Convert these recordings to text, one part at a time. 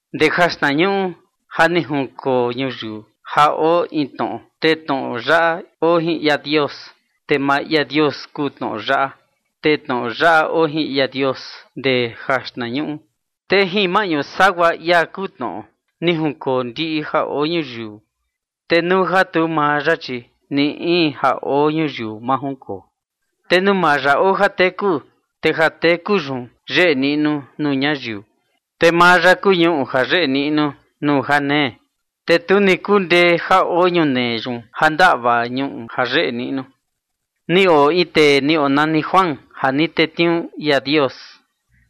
Ndee jaxtnañuꞌu ja ni junkoo ñuyiu ja oo in tnoꞌo, te tnoꞌo yaꞌa oo jin ia Dios, te maa ia Dios kuu tnoꞌo yaꞌa. Te tnoꞌo yaꞌa oo jin ia Dios ndee jaxtnañuꞌu. Te jin maꞌñu sagua ia kuu tnoꞌo, ni junkoo ndiꞌi ja oo ñuyiu, te nuu ja tu maa ya, chi ni in ja oo ñuyiu ma junkoo. Te nuu maa ya oo jateku, te jateku yun yeꞌe niꞌnu nuu ñayiu. Te maa ya kuu ñuꞌu ja yeꞌe niꞌnu nuu janee, te tu ni kundee ja oo ñunee yun ja ndaꞌva ñuꞌu ja yeꞌe niꞌnu. Ni oo in tee ni onani Juan ja ni tetniuu ia Dios.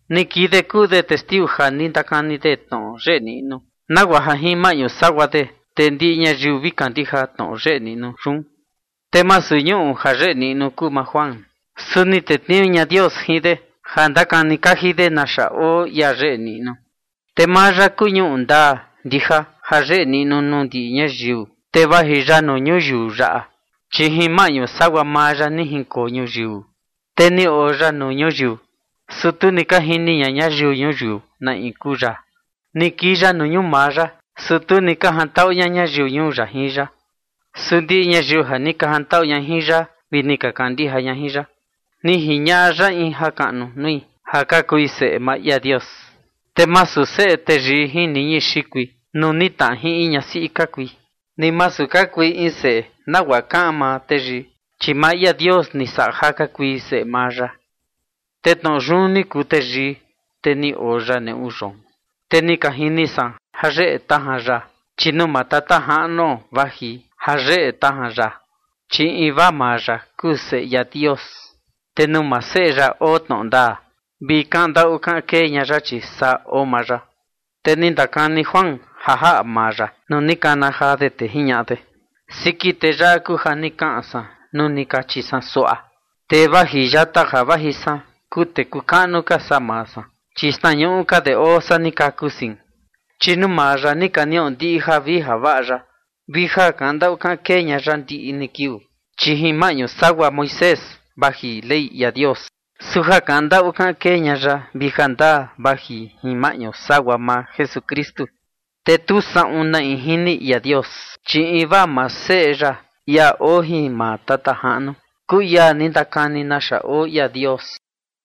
Ni kii de kuu de testiu ja ni ndakani de tnoꞌo yeꞌe niꞌnu, nagua ja jin maꞌñu sagua de, te ndiꞌi ñayiu vi kandija tnoꞌo yeꞌe niꞌnu yun. Te masu ñuꞌu ja yeꞌe niꞌnu kuu maa Juan, su ni tetniuu ña Dios jin de ja ndakani kaji de naxa oo ia yeꞌe niꞌnu. Te maa ya kuu ñuꞌu ndaa ndija ja yeꞌe niꞌnu nuu ndiꞌi ñayiu, te vaji ya nuu ñuyiu yaꞌa. Chi jin maꞌñu sagua maa ya ni junkoo ñuyiu, te ni oo ya nuu ñuyiu, su tu ni ka jini ña ñayiu ñuyiu na in kuu ya. Ni kii ya nuu ñuu maa ya, su tu ni ka jantaꞌu ña ñayiu ñuu ya jin ya. Su ndiꞌi ñayiu ja ni ka jantaꞌu ya, vi ni ka kandijai ya, ni jiñaꞌa ya in jakaꞌnu nui ja ka kui seꞌe maa ia Dios. Te masu seꞌe teyii jin niñi xikui nuu ni tnaꞌa jin in ñasiꞌi ka kui, ni masu ka kui in seꞌe nagua kaꞌan maa teyii, chi maa ia Dios ni saꞌa ja ka kui seꞌe maa ya. Te tnoꞌo yun ni kuu teyii, te ni oo ya neꞌu yoon, te ni ka jini san ja yeꞌe tajan ya, chi nuu maa Tata Jaꞌnuo vaji ja yeꞌe tajan ya, chi invaa maa ya kuu Seꞌe ia Dios. Te nuu maa Seꞌe ya oo tnoꞌo ndaa vi kaꞌan ndaꞌu kaꞌan kee ña ya, chi saa oo maa ya. Te ni ndakani Juan ja jaꞌa maa ya nuu ni kana jaa de, te jiñaꞌa de: ―Siki tee yaꞌa kuu ja ni kaꞌan san nuu ni kachi san suaꞌa: “Tee vaji yata ja vaji san kuu tee kuu kaꞌnu ka saa maa san, chi xtnañuꞌu ka de oo saa ni kaku sein”. Chi nuu maa ya ni ka niꞌo ndiꞌi javii javaꞌa ya vi ja kaꞌan ndaꞌu kaꞌan kee ña ya ndiꞌi ni kiuu. Chi jin maꞌñu sagua Moisés vaji Ley ia Dios, su ja kaꞌan ndaꞌu kaꞌan kee ña ya vi jandaa vaji jin maꞌñu sagua maa Jesukristu. Te tu saꞌun na in jini ia Dios, chi invaa maa Seꞌe ya, ia oo jin maa Tata Jaꞌnu, kuu ia ni ndakani naxa oo ia Dios.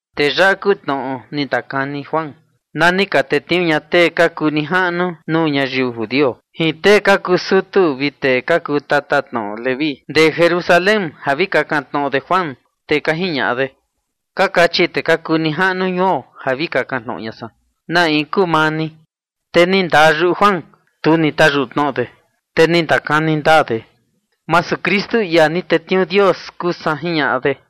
Te yaꞌa kuu tnoꞌo ni ndakani Juan na ni ka tetniuu ña tee ka kuu nijaꞌnu nuu ñayiu judio jin tee ka kuu sutu vi tee ka kuu tatatnoꞌo Leví ndee Jerusalén ja vi kakan tnoꞌo de Juan, te ka jiñaꞌa de: ―Ka kachi tee ka kuu nijaꞌnu ñuo ja vi kakan tnoꞌo ña san, ¿na in kuu maa ni? Te ni ndaa yuꞌu Juan, tu ni tayuꞌu tnoꞌo de, te ni ndakani ndaa de: ―Masu Kristu, ia ni tetniuu Dios, kuu san ―jiñaꞌa de.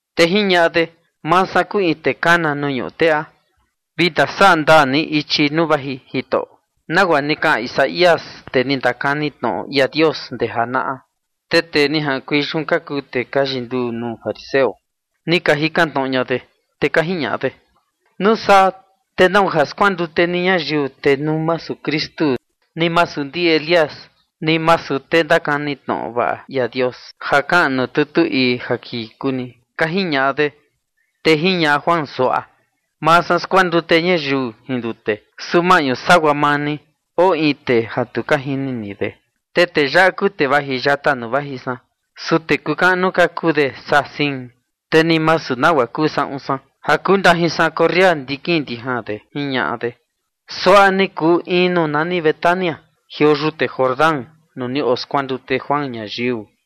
Te jiñaꞌa de: ―Maa san kuu in tee kana nuu ñuꞌu teꞌa: “Vi ndasaꞌa ndaa ni ichi nuu vaji Jitoꞌo”, nagua ni kaꞌan Isaías, tee ni ndakani tnoꞌo ia Dios ndee janaꞌa. Te tee ni jaꞌankuei yun ka kuu tee ka yinduu nuu fariseo, ni ka jikan tnoꞌo ña de, te ka jiñaꞌa de: ―Nuu saa, te ¿nau ja skuandute ni ñayiu, te nuu masu Kristu, ni masu ndi Elías, ni masu tee ndakani tnoꞌo vaꞌa ia Dios ja kaꞌan nuu tutu ii ja kii kuu ni? ―ka jiñaꞌa de. Te jiñaꞌa Juan suaꞌa: ―Maa san skuandute ñayiu jin ndute, su maꞌñu sagua maa ni, oo in tee ja tu ka jini ni de. Te tee yaꞌa kuu tee vaji yata nuu vaji san, su tee kuu kaꞌnu ka kuu de saa sein, te ni masu nagua kuu saꞌun san ja kuu ndajin san corria ndikin ndijan de ―jiñaꞌa de. Suaꞌa ni kuu in nuu nani Betania, jioo yute Jordán, nuu ni oskuandute Juan ñayiu.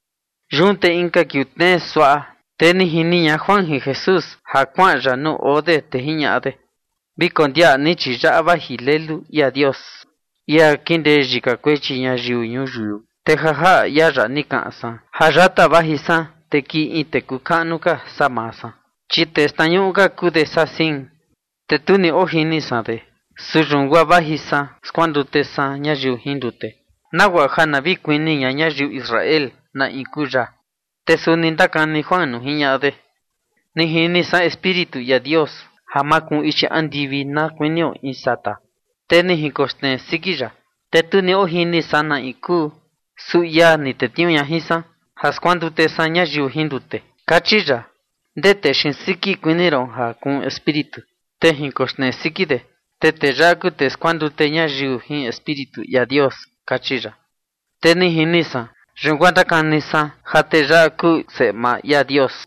Yun te inka kiuu tnee suaꞌa, te ni jini ña Juan jin Jesús ja kuaꞌan ya nuu oo de, te jiñaꞌa de: ―Vi kondiaꞌa ni, chi yaꞌa vaji Lelu ia Dios, ia kindee yika kuechi ñayiu ñuyiu. Te ja jaꞌa ia yaꞌa ni kaꞌan san: “Ja yata vaji san, te kii in tee kuu kaꞌnu ka saa maa san, chi tee xtnañuꞌu ka kuu de saa sein”. Te tu ni ojini san de, su yun guaa vaji san skuandute san ñayiu jin ndute, nagua ja na vi kuni ña ñayiu Israel na in kuu ya. Te suni ndakani Juan nuu jiñaꞌa de: ―Ni jini san Espíritu ia Dios ja makuun ichi andivi na kuinio in sata, te ni jinkoxnee siki ya. Te tu ni ojini san na in kuu. Su ia ni tetniuu ña jin san ja skuandute san ñayiu jin ndute, kachi ya: “Ndee tee xiin siki kuni ron ja kuun Espíritu, te jinkoxnee siki de, te tee yaꞌa kuu tee skuandute ñayiu jin Espíritu ia Dios”, kachi ya. Te ni jini san, yun guaa ndakani san ja tee yaꞌa kuu Seꞌe maa ia Dios.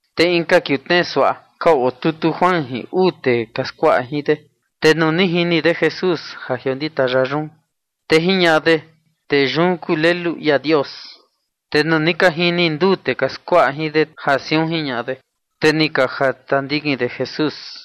Te inka kiuu tnee suaꞌa ka otutu Juan jin uu tee ka skuaꞌa jin de. Te nuu ni jini de Jesús, ja jiondita ya yun, te jiñaꞌa de: ―Tee yun kuu Lelu ia Dios. Te nuu ni ka jini nduu tee ka skuaꞌa jin de ja siun jiñaꞌa de, te ni ka jata ndikin de Jesús.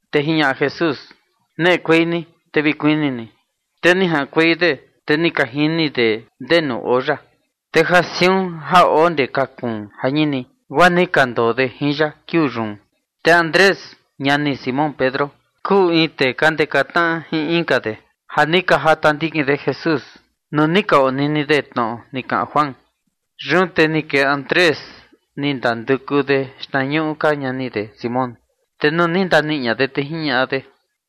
Te jiñaꞌa Jesús: ―Neꞌekuei ni te vi kuni ni. Te ni jaꞌankuei de, te ni ka jini de ndenu oo ya. Te ja siun ja oo ndee ka kuun jañini, guaa ni ka ndoo de jin ya kiuu yun. Te Andrés, ñani Simón Pedro, kuu in tee ka ndeka tnaꞌa jin inka de, ja ni ka jata ndikin de Jesús, nuu ni ka onini de tnoꞌo ni kaꞌan Juan. Yun te ni kee Andrés, ni ndanduku de xtnañuꞌu ka ñani de Simón, te nuu ni ndaniꞌi ña de, te jiñaꞌa de: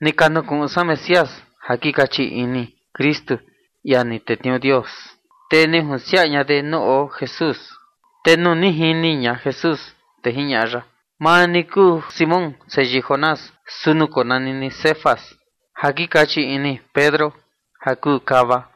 ―Ni ka nukuꞌun san Mesías, (ja kei kaꞌan “Kristu”, ia ni tetniuu Dios). Te ni junsiaꞌa ña de nuu oo Jesús. Te nuu ni jini ña Jesús, te jiñaꞌa ya: ―Maa ni kuu Simón, seyii Jonás, su nukonani ni Cefas, (ja kei kaꞌan Pedro ja kuu kava).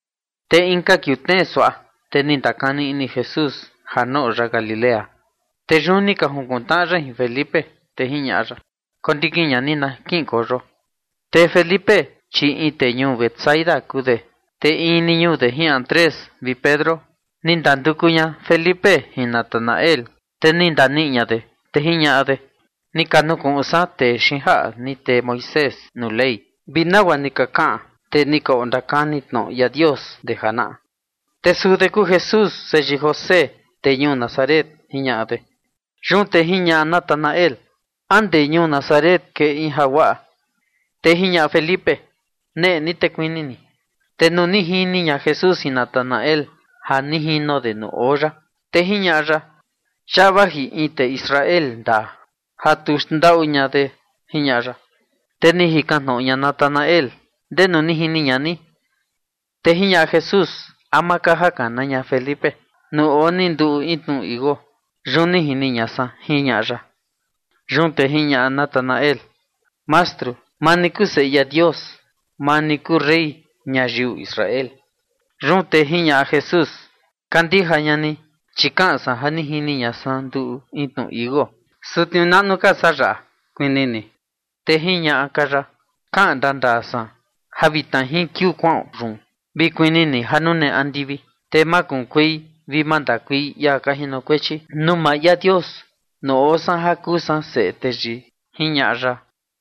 Te inka kiuu tnee suaꞌa, te ni ndakani ini Jesús ja noꞌo ya Galilea, te yun ni ka junkuntnaꞌa ya jin Felipe, te jiñaꞌa ya: ―Kondikin ña ni na kiꞌinkueio. Te Felipe, chi in tee ñuu Betsaida kuu de, te in ni ñuu de jin Andrés vi Pedro. Ni ndanduku ña Felipe jin Natanael, te ni ndaniꞌi ña de, te jiñaꞌa de: ―Ni ka nukuꞌun san tee xiin jaꞌa ni tee Moisés nuu Ley, vi nagua ni ka kaꞌan tee ni ka ondakani tnoꞌo ia Dios ndee janaꞌa. Te suu de kuu Jesús, seyii José, tee ñuu Nazaret ―jiñaꞌa de. Yun te jiñaꞌa Natanael: ―¿A ndee ñuu Nazaret kee in jaguaꞌa? Te jiñaꞌa Felipe: ―Neꞌe ni te kuni ni. Te nuu ni jini ña Jesús jin Natanael ja ni jino de nuu oo ya, te jiñaꞌa ya: ―Yaꞌa vaji in tee Israel ndaa, ja tu xndaꞌu ña de ―jiñaꞌa ya. Te ni jikan tnoꞌo ña Natanael: ―¿Ndenu ni jini ña ni? Te jiñaꞌa Jesús: ―Ama ka ja kana ña Felipe, nuu oo ni nduꞌu in tnu tichi iuu, yun ni jini ña san ―jiñaꞌa ya. Yun te jiñaꞌa Natanael: ―Mastru, maa ni kuu Seꞌe ia Dios; maa ni kuu rey ñayiu Israel. Yun te jiñaꞌa Jesús: ―Kandija ña ni, chi kaꞌan san ja ni jini ña san nduꞌu in tnu tichi iuu, su tniuu naꞌnu ka saa yaꞌa kuni ni. Te jiñaꞌa ka ya: ―Kaꞌan ndandaa san ja vitna jin kiuu kuaꞌon yun, vi kuni ni ja nune andivi, te makunkuei vi mandakuei ia ka jinokuechi nuu maa ia Dios nuu oo san ja kuu san Seꞌe Teyii ―jiñaꞌa ya.